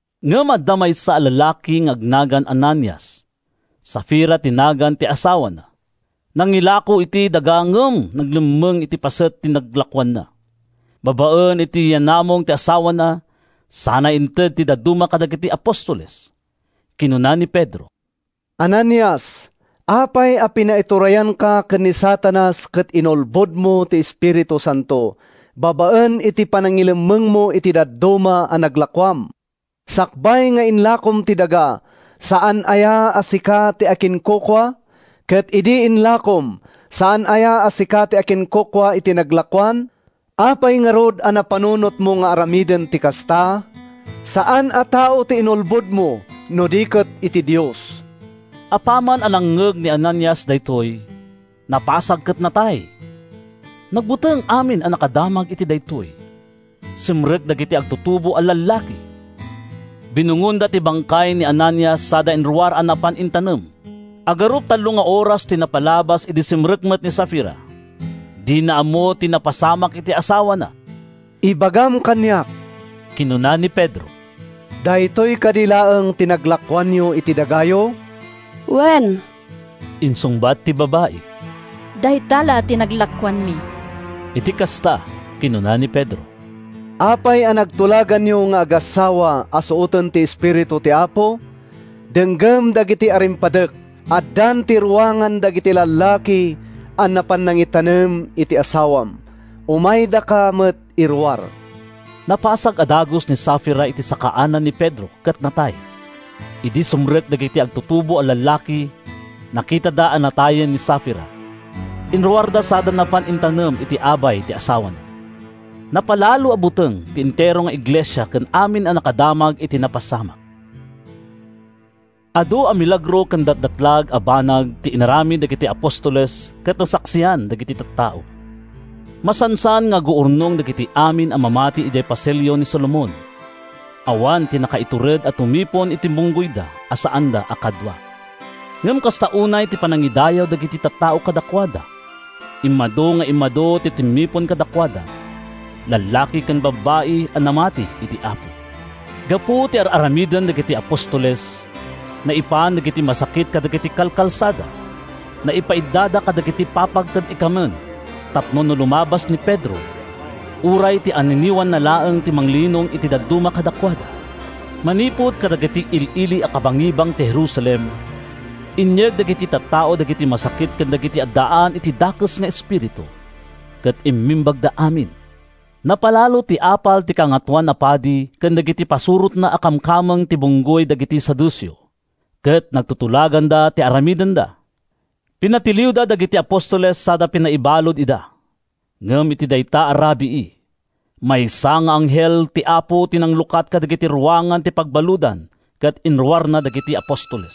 Ngem adda maysa a lalaki nga agnagan Ananias. Safira ti nagan ti asawana. Nangilako iti dagada ngem nangilemmeng iti paset ti naglakoanna, babaen iti yaanamong ti asawana, sana inted ti dadduma kadagiti apostoles. Kinuna ni Pedro, “Ananias, apay a pinaiturayanka ken ni Satanas ket inulbodmo ti Espiritu Santo babaen iti panangilemmengmo iti dadduma a naglakoam? Sakbay nga inlakom ti daga, saan aya a sika ti akinkukua? Ket idi inlakom, saan aya a sika ti akinkukua iti naglakoan? Apay ngarud a napanunotmo nga aramiden ti kasta? Saan a tao ti inulbodmo, no di ket ti Dios!” Apaman a nangngeg ni Ananias daytoy, napasag ket natay. Nagbuteng amin a nakadamag iti daytoy. Simrek dagiti agtutubo a lallaki, binungonda ti bangkay ni Ananias sada inruar a napan intanem. Agarup tallo nga oras ti napalabas idi sumrek met ni Safira. Dina ammo ti napasamak iti asawana. “Ibagam kaniak,” kinuna ni Pedro, “daytoy kadi laeng ti naglakoanyo iti dagayo?” “Wen,” insungbat ti babai, “dayta la ti naglakoanmi.” Iti kasta, kinuna ni Pedro, “Apay a nagtulaganyo nga agassawa a suoten ti Espiritu ti Apo? Denggem dagiti arimpadek! Addan iti ruangan dagiti lallaki a napan nangitanem iti asawam. Umaydaka met iruar!” Napasag a dagus ni Safira iti sakaanan ni Pedro ket natay. Idi sumrek dagiti agtutubo a lallaki, nakitada a natayen ni Safira. Inruarda sada napan intanem iti abay ti asawana. Napalalo a buteng ti entero nga iglesia ken amin a nakadamag iti napasamak. Adu a milagro ken datdatlag a banag ti inaramid dagiti apostoles ket nasaksian dagiti tattao. Masansan nga aguurnong dagiti amin a mamati idiay Pasilio ni Solomon. Awan ti nakaitured a tumipon iti bunggoyda a saanda a kadua. Ngem kasta unay ti panangidayaw dagiti tattao kadakuada. Immadu nga immadu ti timmipon kadakuada—lallaki ken babbai a namati iti Apo. Gapu iti ar-aramiden dagiti apostoles, naipan dagiti masakit kadagiti kalkalsada. Naipaiddada kadagiti papag ken ikamen tapno no lumabas ni Pedro, uray ti anniniwanna laeng ti manglinong iti dadduma kadakuada. Manipud kadagiti il-ili a kabangibang ti Jerusalem, inyeg dagiti tattao dagiti masakit ken dagiti addaan iti dakes nga espiritu. Ket immimbagda amin. Napalalo ti apal ti Kangatoan a Padi ken dagiti pasurotna a kamkameng ti bunggoy dagiti Saduceo, ket nagtutulaganda ti aramidenda. Pinatiliwda dagiti apostoles sada pinaibalud ida. Ngem iti dayta a rabii, maysa nga anghel ti Apo ti nanglukat kadagiti ruangan ti pagbaludan ket inruarna dagiti apostoles.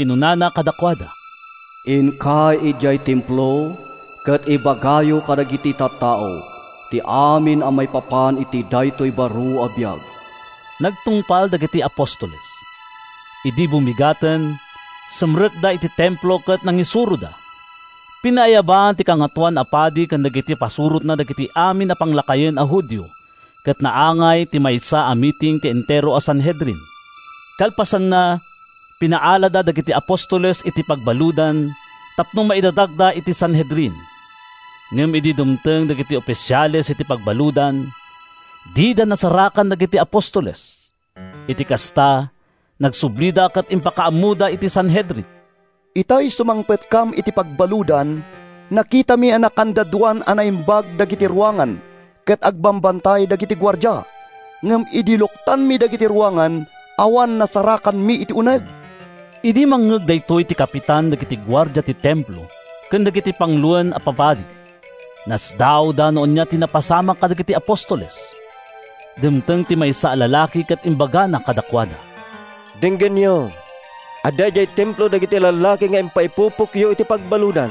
Kinunana kadakuada, “Inkay idiay Templo ket ibagayo kadagiti tattao ti amin a maipapan iti daytoy baro a biag.” Nagtungpal dagiti apostoles. Idi bumigaten, simrekda iti Templo ket nangisuroda. Pinaayaban ti Kangatoan a Padi ken dagiti pasurotna dagiti amin a panglakayen a Judio ket naangay ti maysa a miting ti entero a Sanhedrin. Kalpasanna, pinaalada dagiti apostoles iti pagbaludan tapno maidatagda iti Sanhedrin. Ngem idi dumteng dagiti ofisiales iti pagbaludan, dida nasarakan dagiti apostoles. Iti kasta, nagsublida ket impakaammoda iti Sanhedrin, “Itay sumangpetkam iti pagbaludan, nakitami a nakandadoan a naimbag dagiti ruangan ket agbambantay dagiti guardia. Ngem idi luktanmi dagiti ruangan, awan nasarakanmi iti uneg!” Idi mangngeg daytoy ti kapitan dagiti guardia ti Templo ken dagiti panguloen a papadi, nasdaawda no ania ti napasamak kadagiti apostoles. Dimteng ti maysa a lalaki ket imbagana kadakuada, “Denggenyo! Adda idiay Templo dagiti lallaki a pinaipupokyo iti pagbaludan.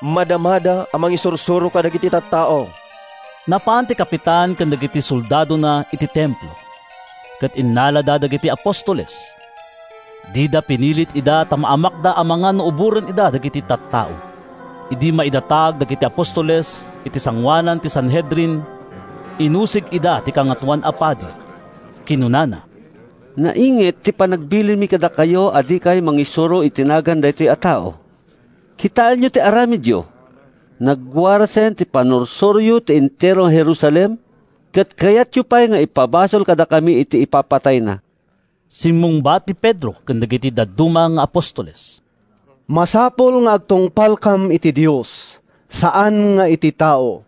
Madamada a mangisursuro kadagiti tattao.” Napan ti kapitan ken dagiti soldadona iti Templo, ket innalada dagiti apostoles. Dida pinilit ida ta maamakda amangan no uboren ida dagiti tattao. Idi maidatag dagiti apostoles, iti sangoanan ti Sanhedrin, inusig ida ti Kangatoan a Padi. Kinunana, “Nainget ti panangbilinmi kadakayo a dikay mangisuro iti nagan daytoy a tao. Kitaenyo ti aramidyo! Nagwarasen ti pannursuroyo iti entero a Jerusalem, ket kayatyo pay nga ipabasol kadakami ti ipapatayna.” Simmungbat ni Pedro ken dagiti dadduma nga apostoles, “Masapul nga agtungpalkam iti Dios, saan nga iti tao.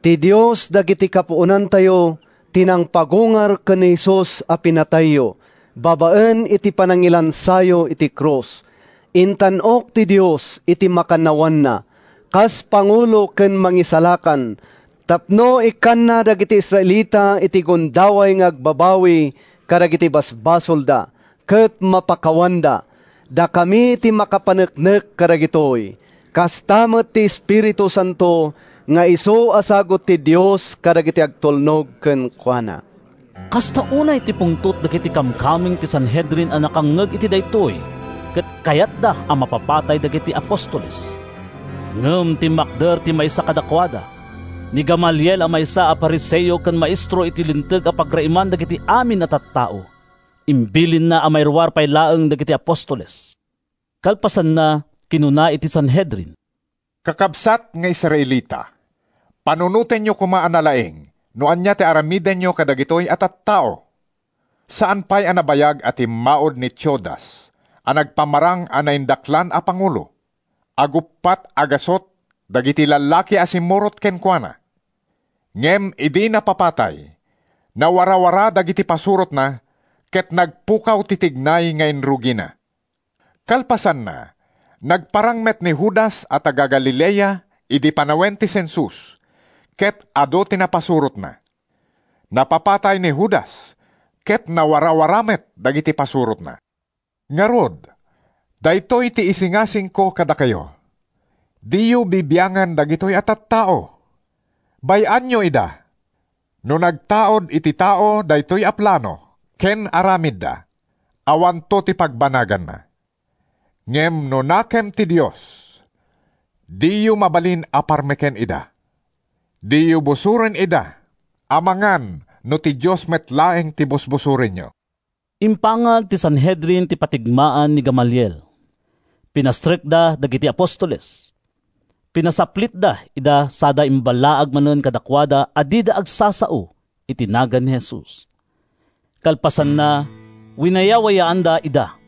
Ti Dios dagiti kapuonantayo ti nangpagungar ken ni Jesus a pinapatayyo babaen iti panangilansayo iti krus. Intan-ok ti Dios iti makannawanna, kas Pangulo ken Mangisalakan, tapno ikkanna dagiti Israelita iti gundaway nga agbabawi kadagiti basbasolda ket mapakawanda. Dakami ti makapaneknek kadagitoy, kasta met ti Espiritu Santo nga isu a sagut ti Dios kadagiti agtulnog kenkuana.” Kasta unay ti pungtot dagiti kamkameng ti Sanhedrin a nakangngeg iti daytoy ket kayatda a mapapatay dagiti apostoles. Ngem timmakder ti maysa kadakuada, ni Gamaliel a maysa a Fariseo ken maestro iti Linteg a pagraeman dagiti amin a tattao. Imbilinna a mairuar pay laeng dagiti apostoles. Kalpasanna, kinuna iti Sanhedrin, “Kakabsat nga Israelita, panunotenyo koma a nalaing no ania ti aramidenyo kadagitoy a tattao. Saan pay a nabayag a timmaud ni Teudas a nagpamarang a naindaklan a pangulo; aguppat a gasut dagiti lallaki a simmurot kenkuana. Ngem idi napapatay, nawarawara dagiti pasurotna ket nagpukaw ti tignay nga inrugina. Kalpasanna, nagparang met ni Judas a taga-Galilea idi panawen ti sensus ket adu ti napasurotna. Napapatay ni Judas ket nawarawara met dagiti pasurotna. “Ngarud, daytoy ti isingasingko kadakayo: Diyo bibiangan dagitoy a tattao. Bay-anyo ida! No nagtaud iti tao daytoy a plano ken aramidda, awanto ti pagbanaganna. Ngem no nakem ti Dios, diyo mabalin a parmeken ida. Diyo busoren ida amangan no ti Dios met laeng ti busbusorenyo!” Impangag ti Sanhedrin ti patigmaan ni Gamaliel. Pinastrekda dagiti apostoles. Pinasaplitda ida sada imballaag manen kadakuada a dida agsasao iti nagan ni Jesus. Kalpasanna, winayawayaanda ida.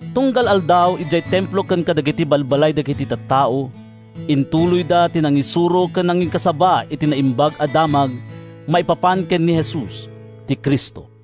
Tunggal aldaw, idiay Templo ken kadagiti balbalay dagiti tattao, intuloyda ti nangisuro ken nangikasaba iti Naimbag a Damag maipapan ken ni Jesus, ti Cristo.